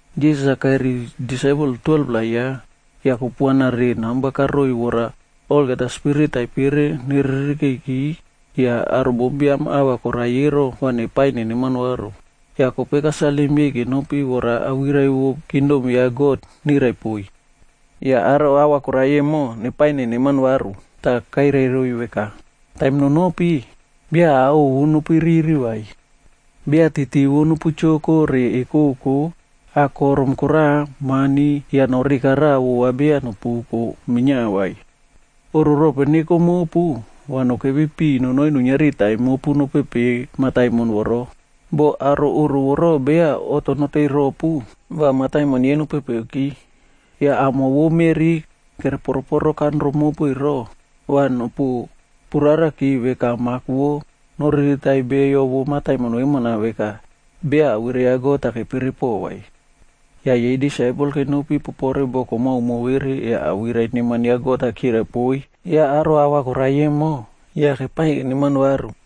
Jisas-a kairiy disaipel 12-pla ya, yah kupuana re namba karoiy vora olgeta spirit taipere neririkeiki yah aro bombiam ahva korai ero, va nepaiy neneman varu. Yah kope kasalim yei kenopi vora awirai vo kingdom ya God nirai poiy. Yah aro ahva korai emo, nepaiy neneman varu. Tah kairai roiy veka, “Taim nonopi, beya ao ovu nopuiriri vai. Beya titi vo nopu choko re ekoko, akorom koraꞌa, mani, yah noreka raꞌa vova beya nopuko minia vai. Oꞌro rope neko mopu, va nokepi piꞌiy nonoi nuiniari taim mopu nopepe mataimon voro. Boh aro oꞌro voro beya oꞌto noteiy ropu, va mataimon yei nopepeki. Yah amo vo meꞌri kere poro poro kanro mopu ero, va nopu purarakia veka mak vo noriritaiy beyo vo mataimon vemona veka beya awirai ya God-a kepere poꞌo vai.” Yah yei disaipel kenopi popore boko maomao vere yah awirai neman ya God-a kirai poiy yah aro ahva koraiy emo, yah kepaiy keneman varu.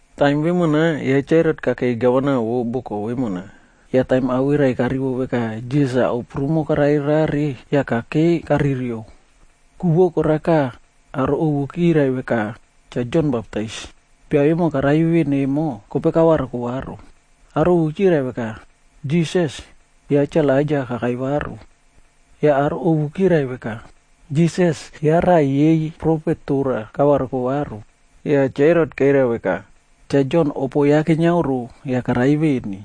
Taim vemona ya Cha Herot kakei gavanab vo boko vemona. Yah taim awirai karivo veka Jisas-a ao prumo karare rare, yah kakei karirio. Ku vo koraka aro ovu kirai veka Cha Jon Baptais, bia vemo karai veꞌen emo, kope kavariko varu. Aro ovu kirai veka, Jisas, ya Cha Elaija kakai varu, yah aro ovu kirai veka, Jisas ya raꞌa yei profet tora kavariko varu. Yah Cha Herot kairai veka, “Cha Jon opo ya keniaoro yah karai veni,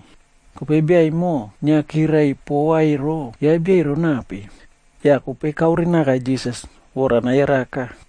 kope bia emo inia kirirai pova ero, ya bia ero nape?” Yah kope kaore naka Jisas vora nayaraka.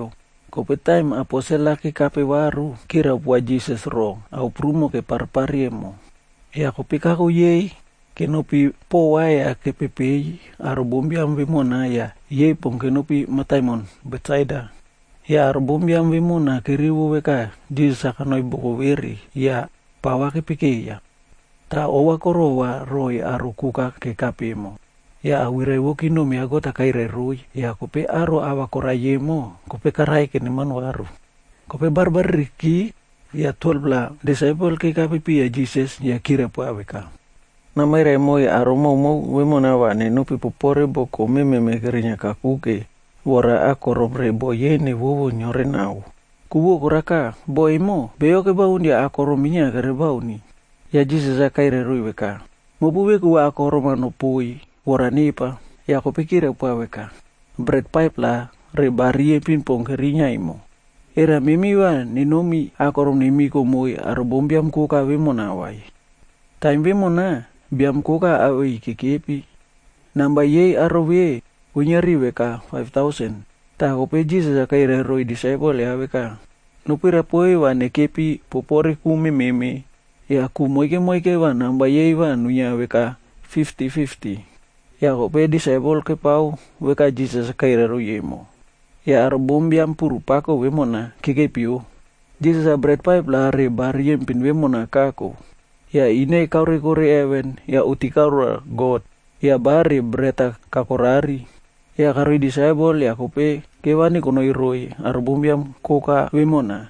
Kope taim aposel-a kekape varu, kirai poa Jisas roꞌo ao prumo kepare pare emo. Yah kope kako yei kenopi pova yah kepepeiy aro bombiam vemona yah yei pon kenopi mataimon Betsaida. Yah aro bombiam vemona kerivo veka Jisas kanoi boko vere yah pava kepekeiya. Tah ova korova roiy aro koka kekape emo, yah awirai vo kingdom ya God-a kairai roiy yah kope aro ahva koraiy emo, kope karaiy keneman varu. Kope barbaririki yah 12-pla disaipel kekape piya Jisas yah kirai poa veka, “Namairai moiy aro maomao vemona va nenopi popore boko mememe kerinia kakuke vora akorom re bo yei nevovo neore nao. Ku vo koraka, bo emo, beyo kebaun yah akorom minia kere bauni.” Yah Jisas kairai roiy veka, “Mopu veku va akorom-a nopoiy vora nepa.” Yah kope kirai poa veka, “Bret 5-plac re ba riyempin pon kerinia emo. Era memi va nenomi akorom nemiko moiy aro bombiam koka vemona vai?” Taim vemona, biam koka awei kekepi, namba yei aro ve, kuiniari veka faiv tausen.d Tah kope Jisas kairai roiy disaipel ya veka, “Nopirai poiy va nekepi popore ku mememe yah ku moike moike va namba yei va nuinia veka fifti fifti.” Yah kope disaipel kepao veka Jisas kairai roiy emo, yah aro bombiam puru pako vemona kekepio. Jisas-a bret 5-pla re ba riyempin vemona kako yah ine kaoreko heven yah oꞌti karao roa God yah ba re bret-a kakorari. Yah karoiy disaipel yah kope kevani nonoi roiy aro bombiam koka vemona.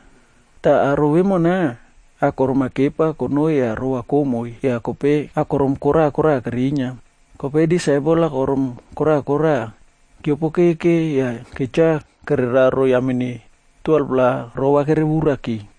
Tah aro vemona akorom-a kepa konoi yah romova komoi yah kope akorom kora kora kerinia. Kope disaipel akorom kora kora kiopokeke yah ketcha kere raro yamene 12-pla rova kerevuraki.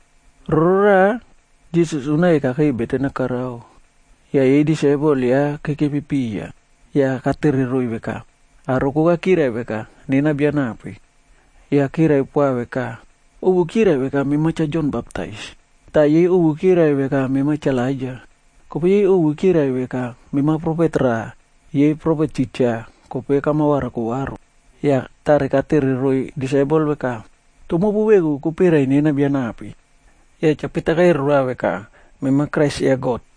Roraꞌa, Jisas unake kakei beten-a karao yah yei disaipel ya kekepi piya, yah katere roiy veka, “Aro koka kirai veka nena bia nape?” Yah kirai poa veka, “Ovu kirai veka mema Cha Jon Baptais, tah yei ovu kirai veka mema Cha Elaija, kope yei ovu kirai veka mema profet raꞌa yei profet titja kope kama variko varu.” Yah tare katere roiy disaipel veka, “Toh mopu veku kopirai nena bia nape?” Yah Cha Pita kairai roa veka, “Mema Kraise ya God.”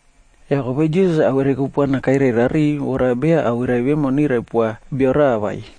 Yah kope Jisas-a awirai kupuana kairai rariꞌiy vora beya awirai vemo nirai poa bia raꞌa vai.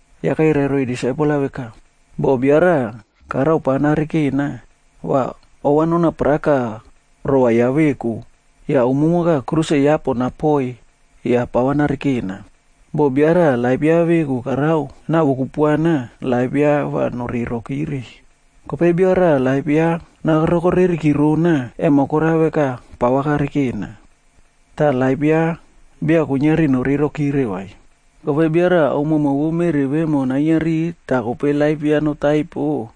Yah kairai roiy disaipel-a veka, “Boh bia raꞌa karao pava narekena, va ova nona paraka rova ya veku yah umumoka, kruse ya poꞌon napoiyf yah pava narekena. Boh bia raꞌa laip ya veku karao nawo kupuana, laip ya va noreiy rokire. Kope bia raꞌa laip ya naroko reriki rona, emo korao veka pava karekena, tah laip ya beya kuiniari noreiy rokire vai. Kope bia raꞌa ao maomao vo meꞌri vemona nainiari tah kope laip ya notaipo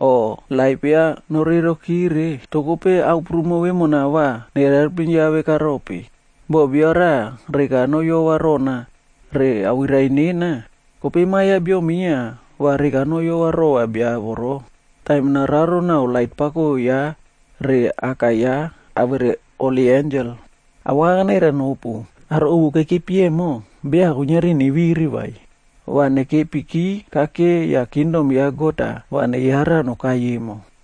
o laip ya noreirokire, toh kope ao prumo vemona va nere helpim ya vekarope? Boh bia raꞌa reka noyova rona re awirai nena, kope Ma Biam ya Bio minia va reka noyova rova bia voro, taim nararo naꞌao lait pako ya re Aka ya, awere holi ensel. Awaka kanairai nopu, aro ovu kekepi emo, beya kuiniari neviri vai, va nekepiki kake yah kingdom ya God-a va neyara nokai emo.”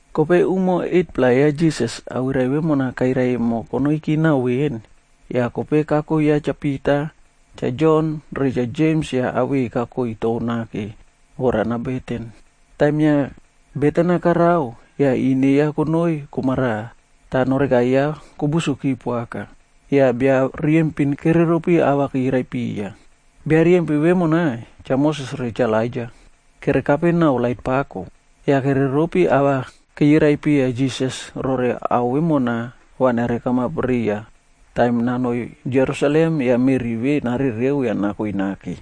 Kope umo 8-pla ya Jisas awirai vemona kairai emo konoiki nao veni, yah kope kako ya Cha Pita, Cha Jon re Cha Jems yah awei kakoi tou nake vora nabeten. Taim inia beten-a karao, yah ine ya konoi komaraꞌa tah noreka ya kobusoki poaka. Yah bia riyempin kereropi ava kirai piya. Bia riyempin vemona, Cha Moses re Cha Elaija. Kerekape nao lait pako. Yah kereropi ava chirai piya Jisas rore ao vemona va nere kamap riya taim nanoi Jerusalem yah meꞌri ve narereo yah nakoi nake.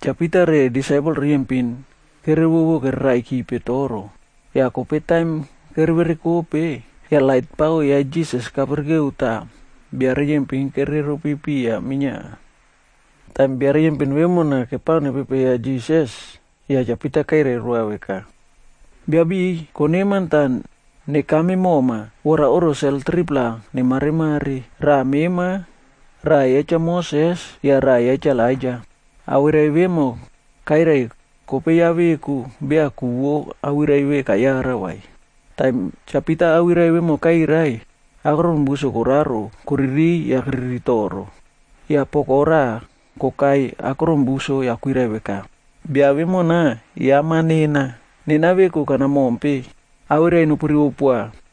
Cha Pita re disaipel riyempin kevovo keraikipe toro, yah kope taim keverekope, yah lait pako ya Jisas kapirike tah bia riyempin kere ropi piya minia. Taim bia riyempin vemo kepao nere pepeiya Jisas, yah Cha Pita kairai roa veka, “Biabiꞌiy, koneman tah nekame moma, va oꞌro sel 3-pla nemaremare, raꞌa mema, raꞌa ya Cha Moses yah raꞌa ya Cha Elaija.” Awirai vemo kairai kope ya veku beya ku vo awirai ve kayara vai. Taim Cha Pita awirai vemona kairai, akron buso koraro koririy yah keriri toro. Yah poko raꞌa kokai akron buso yah kwirai veka, “Bia vemona ya Ma nena, nena veku kana mompe. Awirai nopu rivo poa.”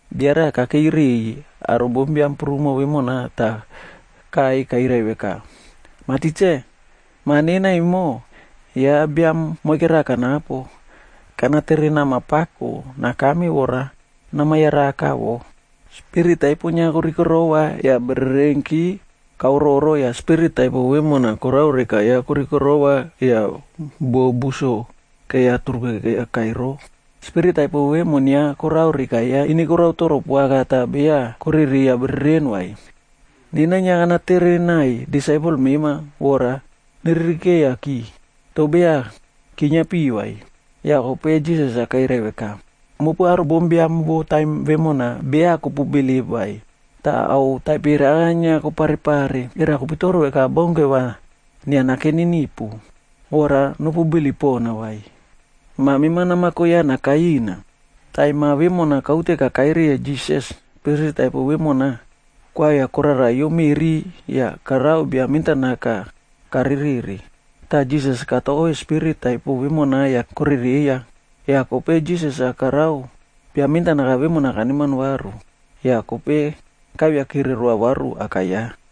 Bia raꞌa kakei riꞌiy aro bombiam prumo vemona tah kaꞌai kairai veka, “Mah Tikse, ma nena emo, ya biam moike raꞌa kanapo, tah kana tere nama poaka nakame vora nama yaraka wo. Spirit taipo inia korikirowa yah bererenki kaororo yah spirit taipo vemona karao reka ya korikirowa yah buo buso keiya turuke kokai roo. Spirit taipo vemona inia korao reka ya ine korao toro poaka tah beya korereiya bereren vai. Nena inia kana tere naiy disaipel mema vora neririkeiyaki, toh beya kiniapi vai.” Yah kope Jisas-a kairai veka, “Mopu aro bombiam vo taim vemona beya kopu bilip vai, tah ao taipere aka inia kopare pare. Era kopitoro veka baunke va inia nakeni nipu, vora nopu bilip pona vai? Ma mema namako ya nakai ina.” Taim ma vemona kaute kakai riya Jisas, spirit taipo vemo, koavia koraraiyo meꞌri yah korao bia mentanaka karereꞌre. Tah Jisas katove spirit taipo vemona yah korereiya. Yah kope Jisas-a karao bia mentanaka vemona kaneman varu. Yah kope kaiviakire roa varu aka ya.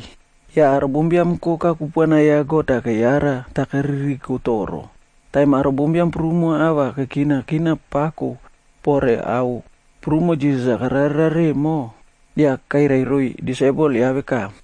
Yah aro bombiam koka kupuana ya God-a keyara tah keririko toro. Taim aro bombiam prumo ova kekina kina pako pore ao prumo Jisas-a karare emo, yah kairai roiy disaipel ya veka,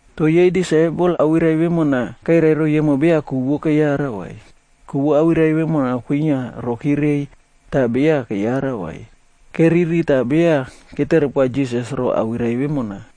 Toh yei disaipel awirai vemona kairai emo beya ku vo keyara vai. Ku vo awirai vemona kwinia rokire reiy tah beya keyara vai. Keriri tah beya ketere poa Jisas ro awirai vemona.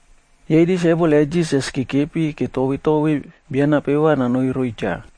Yei disaipel ya Jisas kekepi ketove tove bia nape va nonoi roiy cha.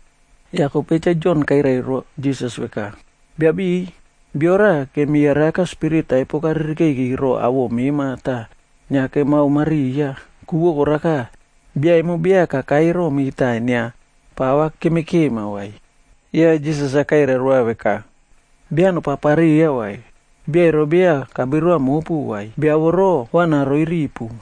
Yah kope Cha Jon kairai roa Jisas-a veka, “Biabiꞌiy, bio raꞌa kemi yaraka spirit taipo karirikeiki roꞌo awoꞌo mema tah inia kemao mariya, ku vo koraka, bia emo beya kakai romi tah inia pa kemekema vai.” Yah Jisas kairai roa veka, “Beya nopapariya vai, bia ero beya kabirua mopu vai, bia voro, va naroi ripu.”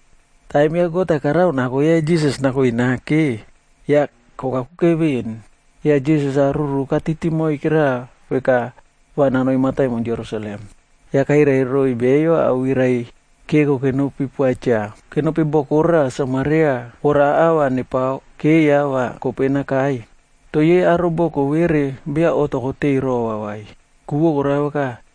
Taim ya God karao nako ya Jisas nakoi nakeg yake kokakuke ven, yah Jisas-a ruru katiti moike raꞌa veka va nanoi mataimon Jerusalem. Yah kairai roiy beyo awirai keko kenopi poa cha. Kenopi boko raꞌa Samaria vora ava nepao keiya va kope nakai. Toh yei aro boko vere beya oꞌto koteiy rova vai, ku vo koraka,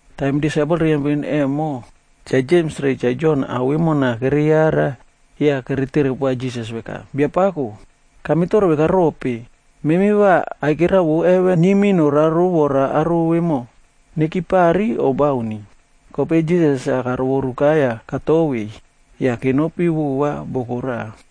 Taim disaipel riyempin emo, Cha Jems re Cha Jon ao vemona kereyara, yah kere tere poa Jisas veka, “Biapako, kamitoro veka rope, memi va aikera vo heven niymi noraro vora aro vemo nekipari, o bauni?” Kope Jisas-a karovoruka yah katovei, yah kenopi vova boko raꞌa.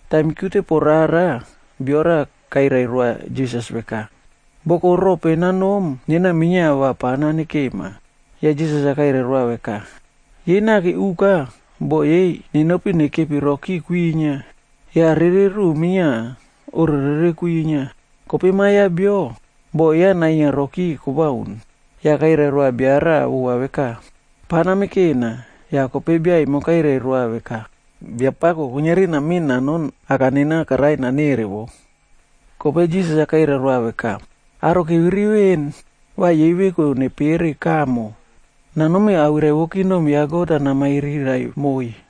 Taim kiute poꞌo rara, bia raꞌa kairai roa Jisas veka, “Boko rope nanom nena minia va pa nane kema.” Yah Jisas-a kairai roa veka, “Yei naki uka, bo yei nenopi nekepi roki kwinia, yah rere ruꞌu minia oꞌro rere kwinia. Kope Ma Biam ya Bio, bo ya nainia roki kobauni.” Yah kairai roa bia raꞌa vova veka, “Pava name kena.” Yah kope bia emo kairai roa veka, “Biapako, kuiniari namiꞌin nanoni aka nena karai nanere wo.” Kope Jisas-a kairai roa veka, “Aro keviri veni va yei veku nepere kamo, nanomi awirai vo kingdom ya God-a namairirai moiy.”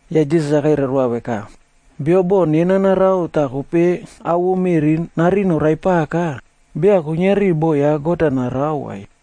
Yah Jisas-a kairai roa veka, “Bio boꞌo nena narao tah kope ao vo meꞌri narin noraipaka, beya kuiniari boꞌo ya God-a narao vai.”